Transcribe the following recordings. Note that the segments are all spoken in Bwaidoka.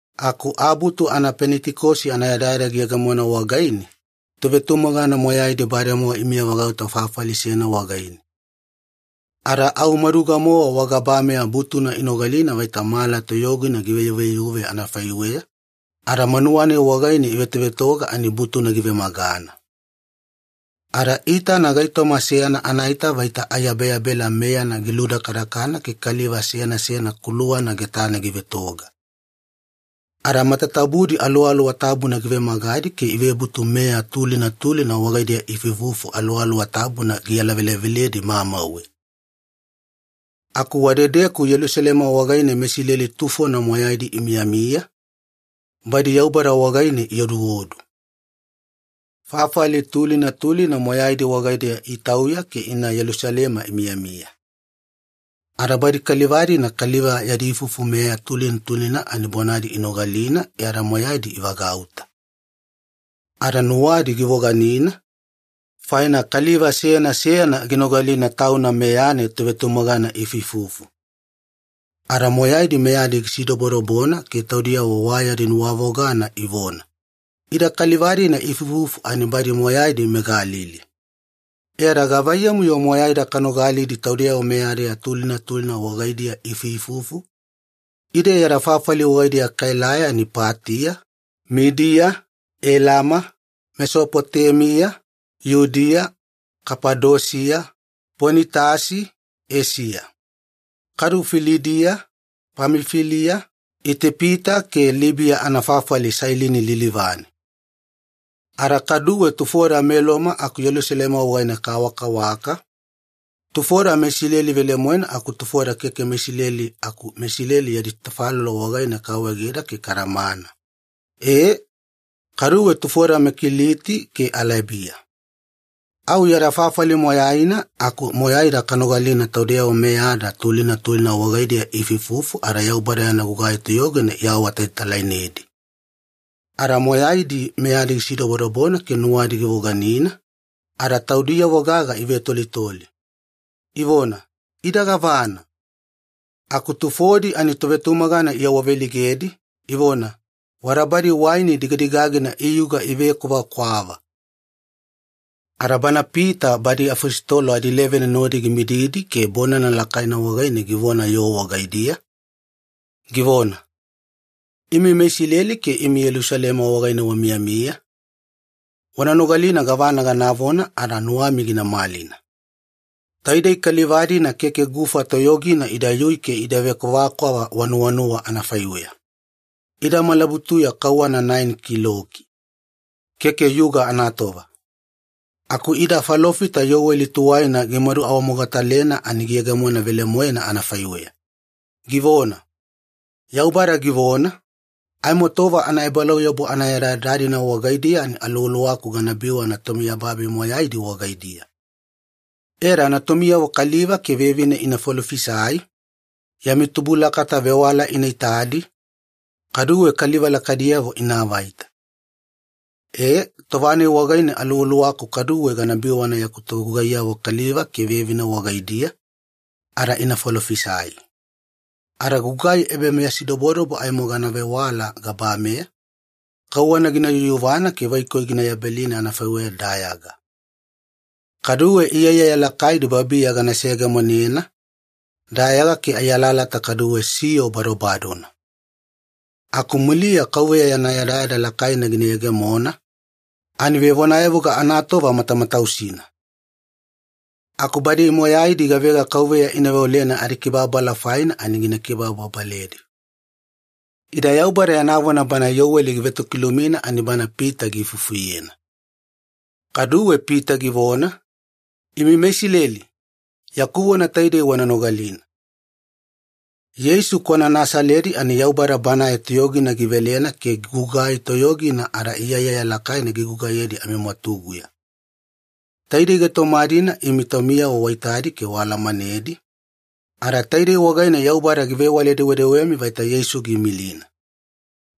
Aku Abutu Penitikosi anayadayada giyegemona wagaine, tovetumagana moyaidi bademowa imiyavagauta fafali seyana wagaine. Ada au maduga-mowa wagabameya butuna inogalina vaita mala toyogina giveyuveyuve anafaiweya, ada manuwa-nai wagaine ivetovetoga ani butuna givemagana. Ada iitana gaitoma seyana anaita vaita aiyabeyabela meyana giludakadakana ke kaliva seyana seyana kuluwana getane givetoga. Ada matatabudi Aluwaluwa Tabuna givemagadi ke ivebutu meya tulina tulina wagaidiya iifuifufu Aluwaluwa Tabuna gialaveleveledi mamauwe. Aku wadedeku Yelusalema wagaine meIsileli tufona moyaidi imiyamiya, badi Yaubada wagaine ioduodu. Fafali tulina tulina moyaidi wagaidiya itauya ke ina Yelusalema imiyamiya. Ada badi kaliva-dina kaliva yadi ifufu meya tulina tulina ani bonadi inogalina e ada moyaidi ivagauta. Ada nuwadi givoganina, faina kaliva seyana seyana ginogalina tauna meyane tovetumagana iifuifufu. Ada moyaidi meyadi gisidobodobona ke taudiyavo wa yadi nuwavogana ivona, “Ida kaliva-dina iifuifufu ani badi moyaidi meGalili. E ada gavaiyamu-yo moyaida kanogalidi taudeyavo meyada tulina tulina wagaidiya iifuifufu? Ide yada fafali wagaidiya kaelai ani Patiya, Midiya, Elama, Mesopotemiya, Yudiya, Kafadosiya, Ponitasi, Eisiya. Kadu Filidiya, Pamifiliya, Itipita ke Libiya anafafali Sailini lilivane. Ada kaduwe tufoda meLoma aku Yelusalema wagaine kawakawaka, tufoda meIsileli velemoena aku tufoda keke meIsileli aku meIsileli yadi tafalolo wagaine kaawaegeda ke kadamana. E, kaduwe tufoda meKiliti ke Alebiya. Au yada fafali moyaina aku moyaida kanogalina taudeyavo meyada tulina tulina wagaidiya iifuifufu ada Yaubada yana gugai toyogina iawaawatalatalainedi!” Ada moyaidi meyadi gisidobodobona ke nuwadi givoganina, ada taudiyavo gaga ivetolitoli, ivona, “Ida gavana?” Aku tufodi ani tovetumagana iawaveleigedi, ivona, “Wada badi waini digadigagina iyuga ivekwavakwava.” Ada bana Pita badi afositolo adileveni nodi gimididi ke bonana lakaina wagaine givona yoo wagaidiya, givona, “Imi meIsileli ke imi Yelusalema wagaine wamiyamiya, wana nogalina gavana ganavona ada nuwami gina malina. Taidei kaliva-dina keke gufa toyogina idayui ke ida vekwavakwava wanuwanuwa anafaiweya. Ida malabutuya kauwana naeni kiloki. Keke yuga anatova. Aku ida falofita Iyoweli tuwaina gimadu awamogatalena ani giyegemona velemoena anafaiweya. Givona, ‘Yaubada givona, Aimo tova anaebalauyabu anayadayada-dina wagaidiya ani Aluwaluwaku gana biwana tomiyababi moyaidi wagaidiya. E ada natumiyavo kaliva ke vevine ina falofisai, yami tubulakata vewala ina itadi, kaduwe kaliva lakaidiyavo ina avaita. E, tova-nai wagaine Aluwaluwaku kaduwe gana biwana yaku togugaiyavo kaliva ke vevine wagaidiya, ada ina falofisai. Ada gugai ebameyasidobodobo aimo gana vewala gabameya, kauwana gina yuyuvana ke vaikoi gina yabelina anafaiweya dayaga. Kaduwe iyaiyaya lakaidi babiya gana seyegemonena, dayaga ke ai alalata kaduwe siyo badobadona. Aku muliya KAUVEYA yana yadayada lakaina gina yegemona, ani vevonayavuga anatova matamatausina. Aku badi moyaidi gavega KAUVEYA ina veolena adikibababala faina ani gina kibababaledi.’” Ida Yaubada yana vona bana Iyoweli givetokilumina ani bana Pita giifufuyena. Kaduwe Pita givona, “Imi meIsileli, yaku vona taidei wana nogalina. Yeisu kwana Nasaledi ani Yaubada Banae toyogina givelena ke gugai toyogina ada iyaiyaya lakaina gigugaiyedi amimwatuguya. Taidei gaitoma-dina imi taumiyavo waitadi ke waalamanedi, ada taidei wagaine Yaubada givewale-dewedewemi vaita Yeisu giimilina.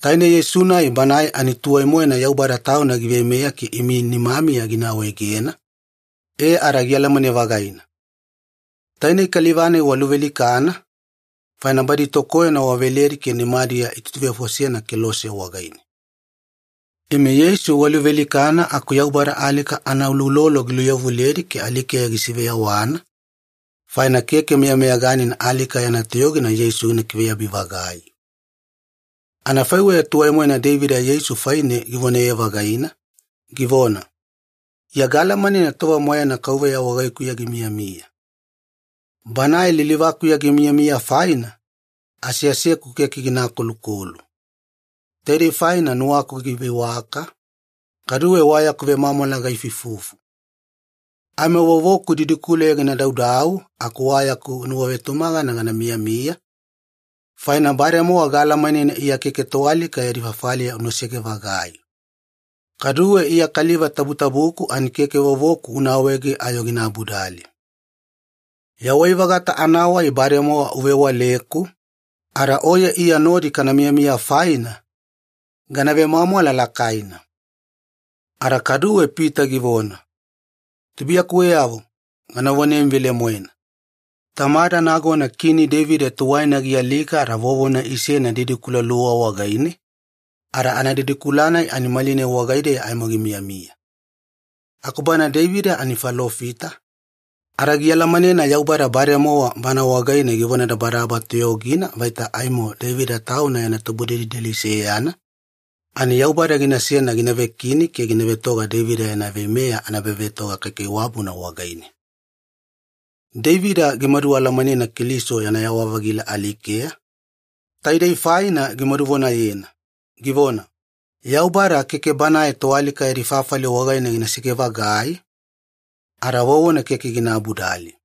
Taine Yeisu-nai Banae ani tuwai-moena Yaubada Tauna giveimeya ke imi nimamiya gina awaegena, e ada gialamane-vagaina. Taidei kaliva-nai waluvealikana, faina badi tokoyona waveledi ke nimadiya itutuvefosena kelose wagaine. Imi Yeisu waluvealikana, aku Yaubada alika anauloulolo giluyavuledi ke alikeya gisiveyawana, faina keke meyameyaganina alika yana toyogina Yeisu gina kiveyabi-vagai. Anafaiweya tuwai-moena Deivida Yeisu faine givonaye-vagaina, givona, ‘Iya gaalamanena tova moyaina KAUVEYA wagaikuya gimiyamiya. Banae lilivakuya gimiyamiya faina, aseaseku keke gina akolukolu. Taidei faina nuwaku giveiwaka, kaduwe wa yaku vemwamwala gaifuifufu. Aimo vovoku didikuleya gina daudau aku wa yaku nuwavetumagana gana miyamiya, faina bademowa gaalamanena Iya keke toalika yadi fafaliya unasege-vagai. Kaduwe Iya ya Kaliva Tabutabuku ani keke vovoku una awaege ayo gina abudali. Yawai-vagata anawai bademowa uvewaleku, ada Oye Iya nodi kana miyami faina, gana vemwamwala lakaina.’” Ada kaduwe Pita givona, “Tubuiyakuweyavo, gana vonemi velemoena, tamada nagona Kini Deivida tuwaina gialika ada vovona isena didikula luwa wagaine, ada anadidikula-nai ani malinai wagaideya aimo gimiyamiya. Aku bana Deivida ani falofita, ada gialamanena Yaubada bademowa bana wagaine givonadabadaba toyogina vaita aimo Deivida tauna yana tubudelideli seyana, ani Yaubada ginasena gina vekini ke gina vetoga Deivida yana veimeya anaebavetoga kaikaiwabuna wagaine. Deivida gimadu alamanena Keliso yana yawa-vagila alikeya, taidei faina gimaduvonayena, givona, ‘Yaubada keke Banae toalika yadi fafali wagaine ginasege-vagai, ada vovona keke gina abudali.’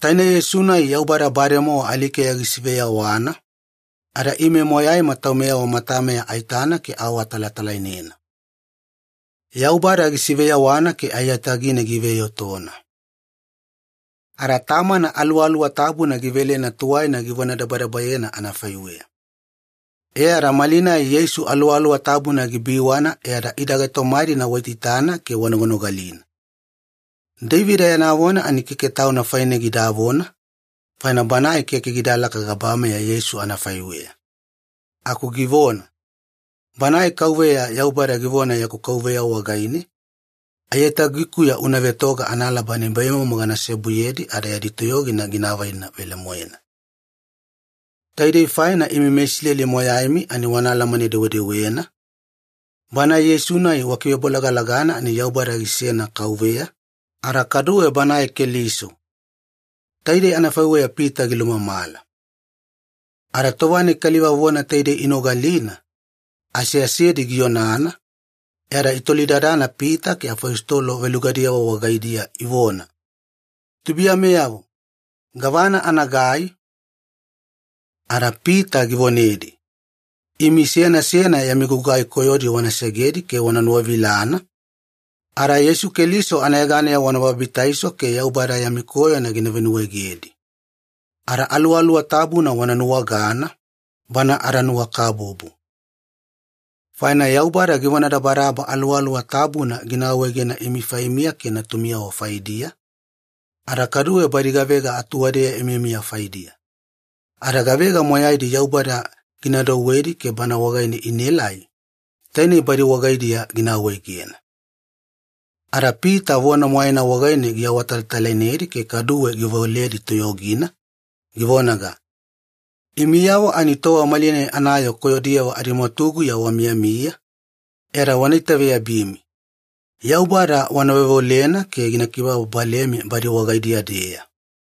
Taine Yeisu-nai Yaubada bademowa alikeya gisiveyawana, ada ime moyaima taumeyavo matameya aitana ke aawatalatalainena. Yaubada gisiveyawana ke aiyatagine giveiotona. Ada Tamana Aluwaluwa Tabuna givelena tuwaina givonadabadabayena anafaiweya. E ada malinai Yeisu Aluwaluwa Tabuna gibiwana e ada ida gaitoma-dina waitaitana ke wanoganogalina. Deivida yana vona ani keke tauna faine gidavona, faina banae keke gidalaka gabameya Yeisu anafaiweya. Aku givona, ‘Banae KAUVEYA Yaubada givona yaku Kauveya wagaine, “Aiyatagikuya una vetoga analaba nibaimomo gana seobuyedi ada yadi toyogina gina avaina velemoena.”; Taidei faina imi meIsileli moyaimi ani wana alamane-dewedewena, Banae Yeisu-nai wakivebolagalagana ani Yaubada gisena Kauveya, ada kaduwe Banae Keliso.” Taidei anafaiweya Pita gilumamala. Ada tova-nai kaliva vona taidei inogalina, aseasedi gionana, e ada itolidadana Pita ke afositolo velugadiyavo wagaidiya ivona, “Tubuiyameyavo, gavana anagai?” Ada Pita givonedi, “Imi seyana seyana yami gugai koyodi wana segedi ke wana nuwavilana, ada Yeisu Keliso anayeganeya wana babitaiso ke Yaubada yami koyona gina venuwaegedi. Ada Aluwaluwa Tabuna wana nuwagana, Bana adanuwakabubu. Faina Yaubada givonadabadaba Aluwaluwa Tabuna gina awaegena imi faimiya ke natumiyavo faidiya, ada kaduwe badi gavega atuwadeya imiyamiya faidiya. Ada gavega moyaidi Yaubada gina douwedi ke Bana wagaine inaelai, tainei badi wagaidiya gina awaegena.” Ada Pita vona moyaina wagaine giawatalatalainedi ke kaduwe giveoledi toyogina, givonaga, “Imiyavo ani tova malinai anayoo koyodiyavo adimwatuguya wamiyamiya, e ada wana itaveyabimi. Yaubada wana veoveolena ke gina kibababalemi badi wagaidiya-deya.”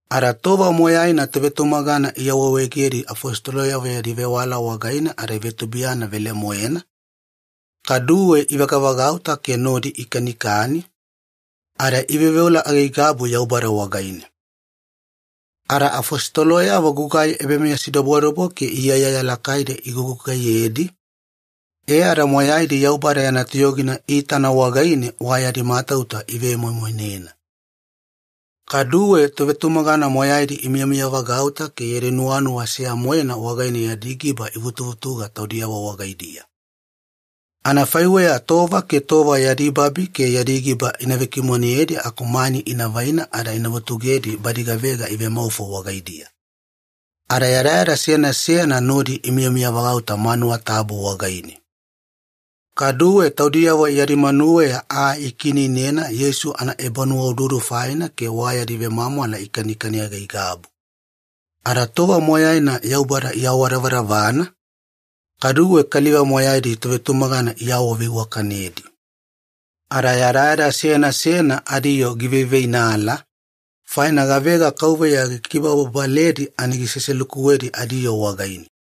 Ada tova moyaina tovetumagana iawaawaegedi afositoloyavo yadi vewala wagaine ada ivetubuiyana velemoena, kaduwe ivagavagauta ke nodi ikanikani, ada iveoveola aigaigabu Yaubada wagaine. Ada afositoloyavo gugai ebameyasidobodobo ke iyaiyaya lakaidi igugugaiyedi, e ada moyaidi Yaubada yana toyogina iitana wagaine wa yadi matauta ivemoimoinena. Kaduwe tovetumagana moyaidi imiyamiyavagauta ke yadi nuwanuwa seya-moena wagaine yadi giba ivutuvutuga taudiyavo wagaidiya. Anafaiweya tova ke tova yadi babi ke yadi giba ina vekimoneyedi aku mani ina vaina ada ina vutugedi badi gavega ivemaufo wagaidiya. Ada yadayada seyana seyana nodi imiyamiyavagauta manuwa tabu wagaine. Kaduwe taudiyavo yadi manuweya aa ikiineinena Yeisu anaebanuwaududu faina ke wa yadi vemwamwala ikanikani aigaigabu. Ada tova moyaina Yaubada iawadavadavana, kaduwe kaliva moyaidi tovetumagana iawaveiwakanedi. Ada yadayada seyana seyana adiyoo giveiveinala, faina gavega Kauveya gikibababaledi ani giseselukuwedi adiyoo wagaine.